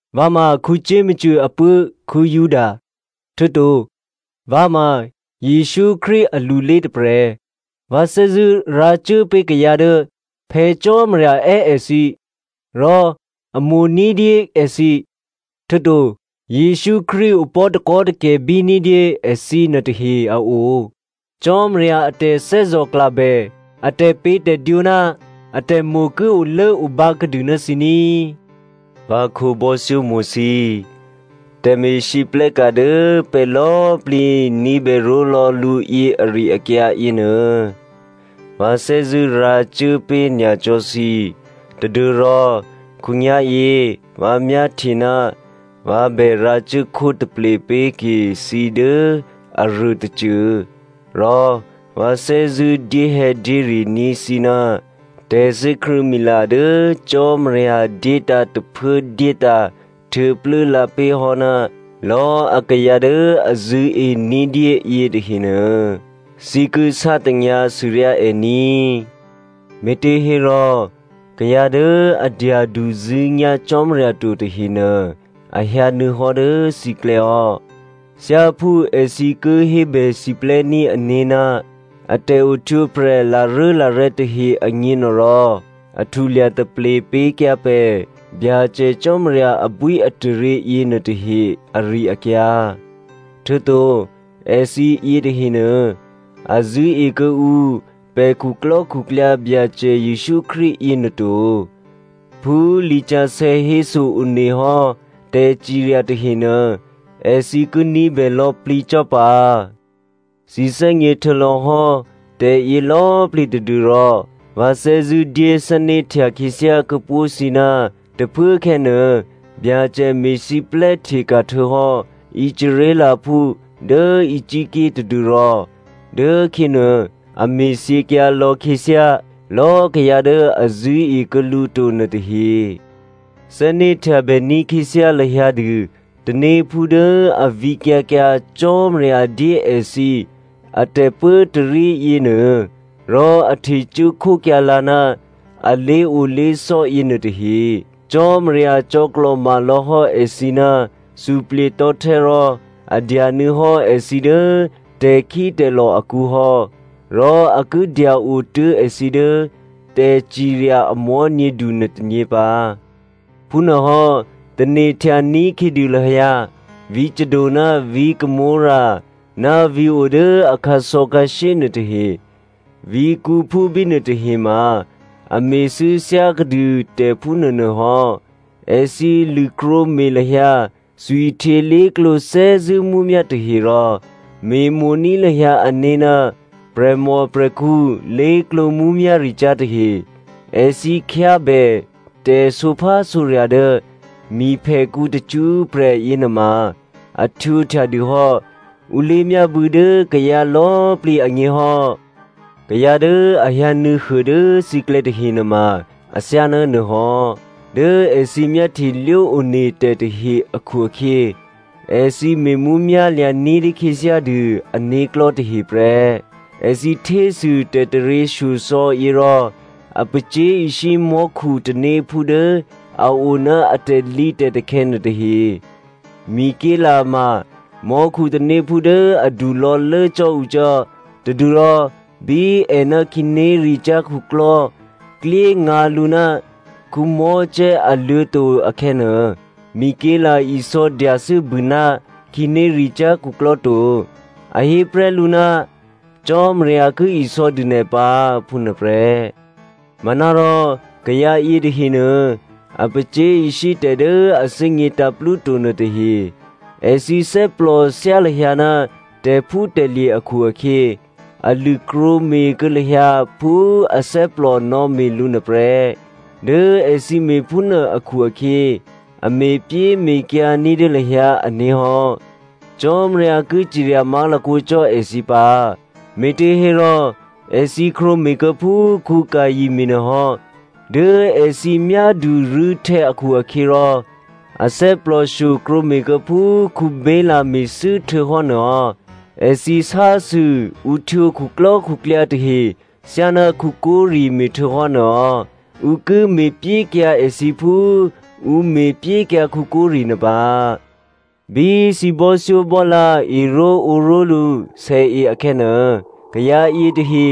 Vǎ ma Jakomo apuố̤ Juda, htuô̌to vǎ ma Jesǔ Krístu alulé tôprè̤. Vǎ thè́zṳ̂́ rǎcuốpé̤ kayǎ dố Phè̌ Cò́marya è́ èthǐ rò a mo̤ ní̤dyé èthǐ, htuô̌to Jesǔ Krístu opò̤́ takò́takè̤bí ní̤dyé èthǐ nuôtahe a o. Cò́marya a tè̤thè́zò̤klabè, a tè̤pě̤tè̤dwǒ ná atè̤mo̤ ki olốobǎ kuô̌dû ná thǐ ní꤮. Vǎ khǒbò́thyómo̤ thǐ꤮, tè̤me̤lwóhteka̤ dố pè̤ lò̌꤮ plǐ ní̤bè ró̤lò̌ lǔ yě ari-akyǎ yěnuô, vǎ thè́zṳ̂́ rǎcuố pé̤ nyacò́ thǐ tadû́rò khǒnyá̤yě vǎ myáhtye ná vǎ bè rǎcuốkhó taple pé̤ke thǐ dố aruô tôcô. Rò vǎ thè́zṳ̂́ dyéhè̌dyére ní̤ thǐ ná tè̤thè́krṳ̂̌mila dố Cò́marya dyétǎ̤ tôphuố dyétǎ̤ htuô̌plû́lǎ pé̤hò́ ná lò̌꤮ akayǎ dố a zṳ̂́e ní̤dyé yětahenuô, thǐ ki sátanyǎ sûryá è ní꤮. Me̤těhérò, kayǎ dố a dyaduzṳ̂́nyá̤ Cò́marya to tahenuô a hyǎnuô̌huô hò́ dố thǐklè̌ hò́. Thyáphú èthǐ ki hébè siplè́ní̤ ané̤ ná a tè̤ohtwǒprè̤ laruốlarè̤ tahe agněnuôrò, a htulya taple pyékyǎ pè̤ Byacè Cò́marya abwíataryě yěnuôtahe ari-akyǎ. Htuô̌to èthǐ yětahenuô a zṳ̂́e kuô̌ǔ pè̤ khuklò́khuklyǎ Byacè Jesǔ Krístu yěnuô to. Phú lisǎsè̌ héso one hò́ tè̤cirya tahenuô èthǐ ki ní̤bè lò̌plǐ cò́ pǎ. Thǐ thè́gně htuô̌lò̌hò́ tè̤yě lò̌꤮ plǐ tadû́rò vǎ thè́zṳ̂́ dyé thè́né̤htya khyěthyá kuô̌pó̤ thǐ ná tôphuốkhè̌ nuô Byacè me̤siplè́ hteka̤htuô̌hò́ Israelphú dố Egypt ké̤ tadû́rò dố khyě nuô a me̤thyěkyǎ lò̌khyěthyá lò̌꤮ kayǎ dố a zṳ̂́ekuô̌ lǔ to nuôtahe. Thè́né̤htyabè ní̤khyěthyá lahyǎ dû tanéphú dố a vǐkyǎ kyǎ Cò́marya dyé èthǐ atè̤pốtarí yěnuô, rò a htecuố khókyǎlǎ ná a lé̤olé̤sò́ yěnuô tahe. Cò́marya cò̌klò̤ma lò̌hò́ èthǐ ná suplye̤tò̤́htè́ rò a dyanuô̌ hò́ èthǐ dố tè̤khítè̤lò̤ akǔ hò́. Rò a ki dya-o tuố̤ èthǐ dố tè̤cirya a mò̤́nyědu nuôtônyě pǎ. Phúnuôhò́, tane̤htya ní̤khyědû lahyǎ vǐ̤ Sodom ná vǐ̤ Gomorra ná vǐ̤ o dố a khǎsò̌khǎshyé nuôtahe. Vǐ̤kǔphú bínuô tahe ma a me̤thû́ thyákuô̌dû tè̤ phúnuô nuô hò́. Èthǐ lṳ̂krwǒme̤ lahyǎ thwihtyě lé̤klǒ thè́zṳ̂́ mǔmyá̤ tahe rò me̤mo̤ní̤ lahyǎ ané̤ ná prè̤mòprè̤khǔ lé̤klǒ mǔmyá̤ricyá̤ tahe. Èthǐ khyábè tè̤sǒphásǒrya̤ dố miphèkǔ tacṳ́prè̤ yěnuôma a htwǒhtya dû hò́ ǔ lé̤myábû̌ dố kayǎ lò̌꤮ plǐ agně hò́. Kayǎ dố a hyǎnuô̌huô dố thǐklè̌ tahe nuôma athyáná nuôhò́. Dố èthǐ myáhtyelwó one tè̤ tahe akhu-akhyě, èthǐ me̤mǔmyá̤ lya̤ ní̤dyé khyěthyá dû ané̤klò̤́ tahe prè́. Èthǐ htésû tè̤taryěshyosò̌ yě rò a pacyé̤ishyé mò́khu tanéphú dố a o ná a tè̤lǐtè̤takhè̌ nuôtahe. Mikelè ma mò́khu tanéphú dố adu lò̌lố cò́ ǔ cò́ tadû́rò bí è ná khǐnéricyá̤ khuklò́ klyéngǎ lǔ ná Mosè aluô̤̌to̤ akhè̌nuô, Mikelè isò̌ dyathû́bû ná khǐnéricyá̤ khuklò́ to. A hé prè́ lǔ, “Cò́marya ki isò̌dû nè̤ pǎ,” phúnuô prè́. Manárò kayǎ yětahenuô a pacyé̤ishyé tè̤ dố a thè́gně tǎ̤plúto nuôtahe. Èthǐ thè́plò thyá lahyǎ ná tè̤phútè̤lye̤ akhu-akhyě, a lṳ̂krwǒ me̤kuô̌ lahyǎ phú athè́plò nò̌me̤ lǔ nuô prè́. Dố èthǐ me̤phúnuô akhu-akhyě a me̤pyéme̤kyǎ ní̤dyé lahyǎ ané̤ hò́. Cò́marya ki cirya má̤lakǒ cò́ èthǐ pǎ! Me̤těhérò èthǐ krwǒme̤kuô̌ phú Caino me̤nuô hò́. Dố èthǐ myádu rû̌htè̌ akhu-akhyěrò, a thè́plòshyo krwǒme̤kuô̌ phú Balaam me̤thû́ htuô̌hò́ nuôhò́. Èthǐ sásû ǔ htwǒ khuklò́khuklyǎ tahe thyáná Kora me̤htuô̌hò́ nuô hò́. Ǔ ki me̤pyékyǎ èthǐ phú ǔ me̤pyékyǎ Kora nuô pǎ. Bí thǐ bò́thyóbò́lǎ eró̤ǒró̤lǔ sèe akhè̌nuô, kayǎ yětahe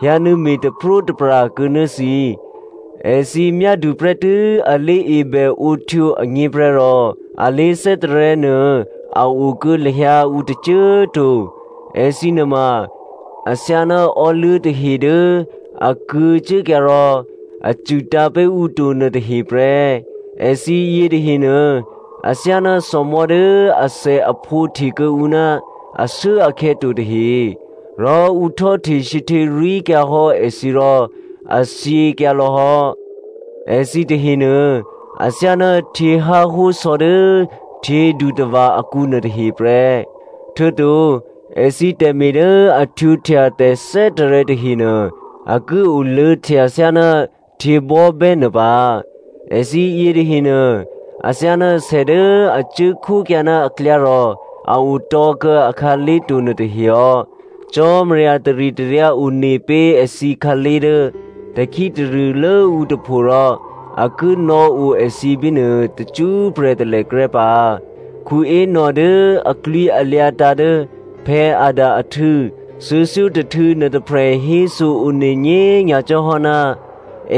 hyǎnuô̌me̤ taprótapra kuô̌ ná thǐ. Èthǐ nuôma athyáná prè̤kyě̤thímí tahe dố a myádu prè́tû́ a lé̤ebèǒhtwǒ agněprè́ rò a lé̤thè́tarè̤̌ nuô a o kuô̌ lahyǎ ǔ tôcô꤮ to. Èthǐ nuôma athyáná ò́luố̤ tahe dố a kuô̌ cuốkyǎ rò a cṳ̂tǎ̤ pé̤ ǔ to nuôtahe prè́. Èthǐ yětahenuô athyáná thòmò̤́ dố athèaphǒ hte kuô̌ǔ ná ashuốakhè̌ to tahe, rò ǔ htò́hte sǐhtěrwí̤kyǎ hò́ èthǐ rò a thyěkyǎ lò̌ hò́. Èthǐ tahenuô, athyáná htyěháhó sò̌ dố htyědutava̤ akǔnuô tahe prè́. Htuô̌to èthǐ tè̤me̤ dố a htwǒhtya tè̤thè́tarè̤̌ tahenuô a ki oluô̌htya thyáná htyěbò́bè́ nuô pǎ. Èthǐ yětahenuô athyáná sè dố a cuốkhókyǎ ná aklyá rò a otò̤̌ kuô̌ a khǎlé̤to nuôtahe hò́. Cò́marya taritaryǎ one pé̤ èthǐ khǎlé̤ dố tè̤khí tarṳ̂ lốǔ tôpho rò a ki nò̌o èthǐ bínuô tacṳ́prè̤ talèkrè́ pǎ. Enoch dố aklwǐalyǎ tǎ̤ dố Adam ahtû̌ thuô̌thyótôhtû̌ nuôtôprè̤ héso one nyě̤ nyacò́ hò́ ná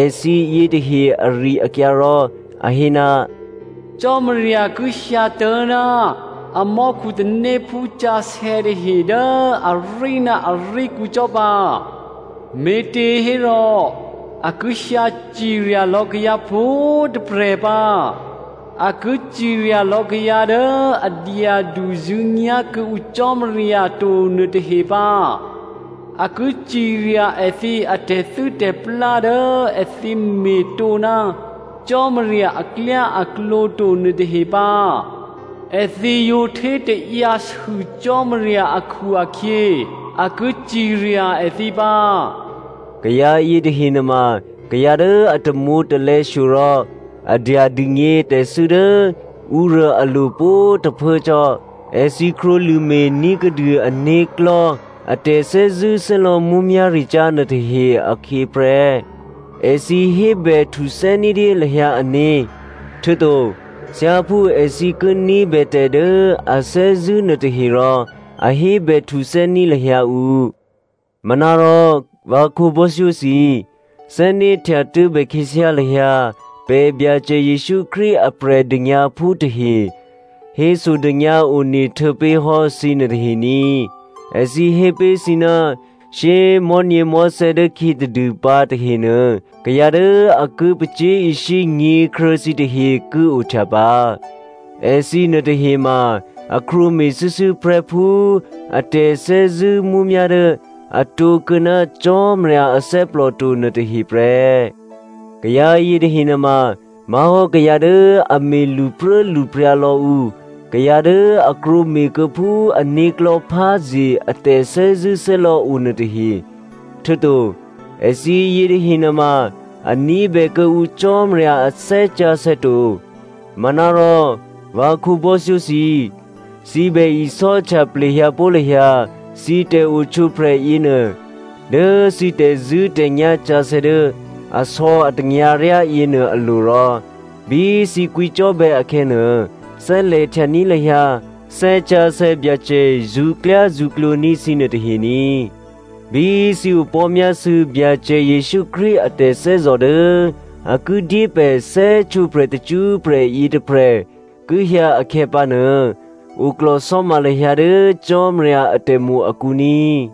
èthǐ yětahe ari-akyǎ rò a hé, “Byacè ki hyǎtố̤ ná amò́khu tanéphú sǎsè̌ tahe dố arí ná aríkǔ cò́ pǎ. Me̤těhérò a ki hyǎ cirya lò̌ kayǎ pwǒ̤꤮ tôprè̤ pǎ. A ki cirya lò̌ kayǎ dố a dyaduzṳ̂́nyá̤ kuô̌ǔ Cò́marya to nuôtahe pǎ. A ki cirya èthǐ atè̤thû́tè̤plá dố èthǐ me̤ tǒ ná Cò́marya aklyáaklǒ to nuôtahe pǎ. Èthǐ yǒ htétaǎyǎ sû Cò́marya akhu-akhyě, a ki cirya èthǐ pǎ.” Kayǎ yětahe nuôma kayǎ dố a tamwǒ̤talè̌ shyo rò a dya dûgně tè̤thû́ dố ǔruô alo̤ pwǒ̤꤮ tôphuố cò́. Èthǐ krwǒlṳ̂me̤ ní̤kuô̌dû ané̤klò̤́ a tè̤thè́zṳ̂́thè́lò̌ mǔmyá̤ricyá̤ nuôtahe akhyě prè́. Èthǐ hébè htuthè́ ní̤dyé lahyǎ ané̤, htuô̌to thyáphú èthǐ ki ní̤bè tè̤ dố a thè́zṳ̂́ nuôtahe rò, a hébè htuthè́ní̤ lahyǎ ǔ. Manárò vǎ khǒbò́thyó thǐ꤮, thè́né̤htya tuố̤bè khyěthyá lahyǎ pè̤ Byacè Jesǔ Krístu a Prè̤dônyǎphú tahe hésodônyǎ one htuô̌pé̤hò́ thǐ nuôtahe ní꤮. Èthǐ hé pé̤ thǐ, “Shyé꤮ mò̤́nyěmò̤́thè̌ dố khyě tadû pǎ tahenuô kayǎ dố a ki pacyé̤ishyé nyě̤kruô̌ thǐ tahe ki ohtya pǎ. Èthǐ nuôtahe ma a krwǒme̤ shuô̌shuô̌ prè́ phú a tè̤thè́zṳ̂́ mǔmyá̤ dố a tǒkuô̌ ná Cò́marya athè́plò to nuôtahe prè́.” Kayǎ yětahe nuôma má̤hò́ kayǎ dố a me̤ lṳpruốlṳpryǎ lò̌ ǔ, kayǎ dố a krwǒme̤kuô̌ phú ané̤klò̤́ pházye a tè̤thè́zṳ̂́thè́lò̌ o nuô tahe, htuô̌to èthǐ yětahe nuôma a ní̤bè kuô̌ǔ Cò́marya a Thè́ Sǎsè̌ to. Manárò vǎ khǒbò́thyó thǐ꤮, thǐ bè isò́htya plehyǎpó̤ lahyǎ thǐ tè̤ohtwǒprè̤ yěnuô dố thǐ tè̤zṳ̂́tè̤nyá̤ sǎsè̌ dố asò̌ atanyǎryá yěnuô alo̤ rò, bí thǐ kwǐcò́bè̌ akhè̌nuô, thè́lè̤htyaní̤ lahyǎ Thè́ Sǎsè̌ Byacè zṳ̌klyázṳ̌klǒ ní̤ thǐ nuôtahe ní꤮. Bí thǐ opò̤́myásû̌ Byacè Jesǔ Krístu a tè̤thè́zò̤ dố a ki dyé pè̤ thè́htwǒprè̤ tacṳ́prè̤ yětôprè̤ ki hyǎ akhè̌pǎnuô, oklò̤sò́ma lahyǎ dố Cò́marya atè̤mo̤ akǔ ní꤮.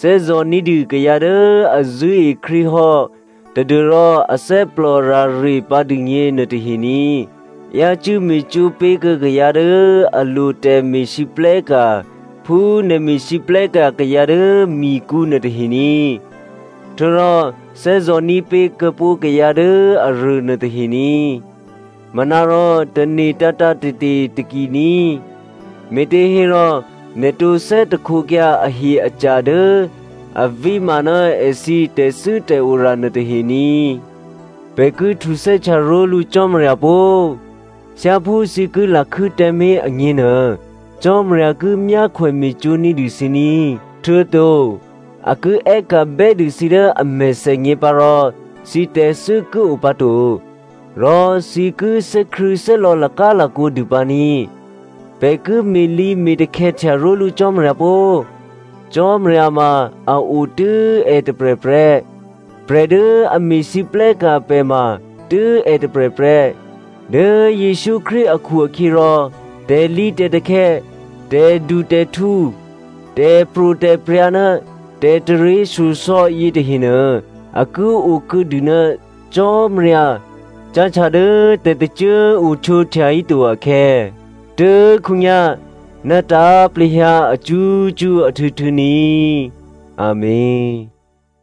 Thè́zò̤ ní̤dû kayǎ dố a zṳ̂́e Krístu hò́ tadû́rò athè́plò rare pǎ dûgně nuôtahe ní꤮. Yácû́ me̤cwó̤ pé̤kuô̌ kayǎ dố a lo tè̤me̤lwóhteka̤ phú nè̤ me̤lwóhteka̤ kayǎ dố mikǔ nuôtahe ní꤮. Htuô̌rò thè́zò̤ní̤ pé̤ kuô̌pó̤ kayǎ dố aruô nuôtahe ní꤮. Manárò tane̤ tǎ̤tǎ̤te̤te̤ taki ní꤮, me̤těhérò nè̤ tǒ thè́htekyǎ ahye-aca̤ dố a víma ná èthǐ tè̤thû́tè̤ora nuôtahe ní꤮. Pè̤ ki htuthè́htya ró̤lǔ Cò́marya pó! Thyáphú thǐ ki lakhû́ tǎmé̤ agněnuô, Cò́marya ki myákhwè me̤cwó̤ ní̤dû thǐ ní꤮. Htuô̌to a ki è́ka̤ bè́dû thǐ dố a mèthènyě pǎ rò thǐ tè̤thû́ ki o pǎ to, rò thǐ ki thè́krṳ̂̌thè́lò̌ lakálakǒ dû pǎ ní꤮. Pè̤ ki me̤lǐ me̤takhè̌htya ró̤lǔ Cò́marya pó! Cò́marya ma a o tû́ è tôprè̤ prè́. Prè̤ dố a me̤lwóhteka̤ pè̤ ma tû́ è tôprè̤ prè́. Dố Jesǔ Krístu akhu-akhyěrò tè̤lǐtè̤takhè̌, tè̤dutè̤htǔ, tè̤pro̤tè̤prya̤ ná tè̤taryěshyosò̌ yětahenuô, a ki okuô̌dû ná Cò́marya cáhtya dố tè̤tôcô꤮ o htwǒhtya híto akhè̌, tuố̤khǒnyá̤, ná tǎ̤plehyǎ acṳ́cṳ́ ahtû̌htû̌ ní꤮, Amèn.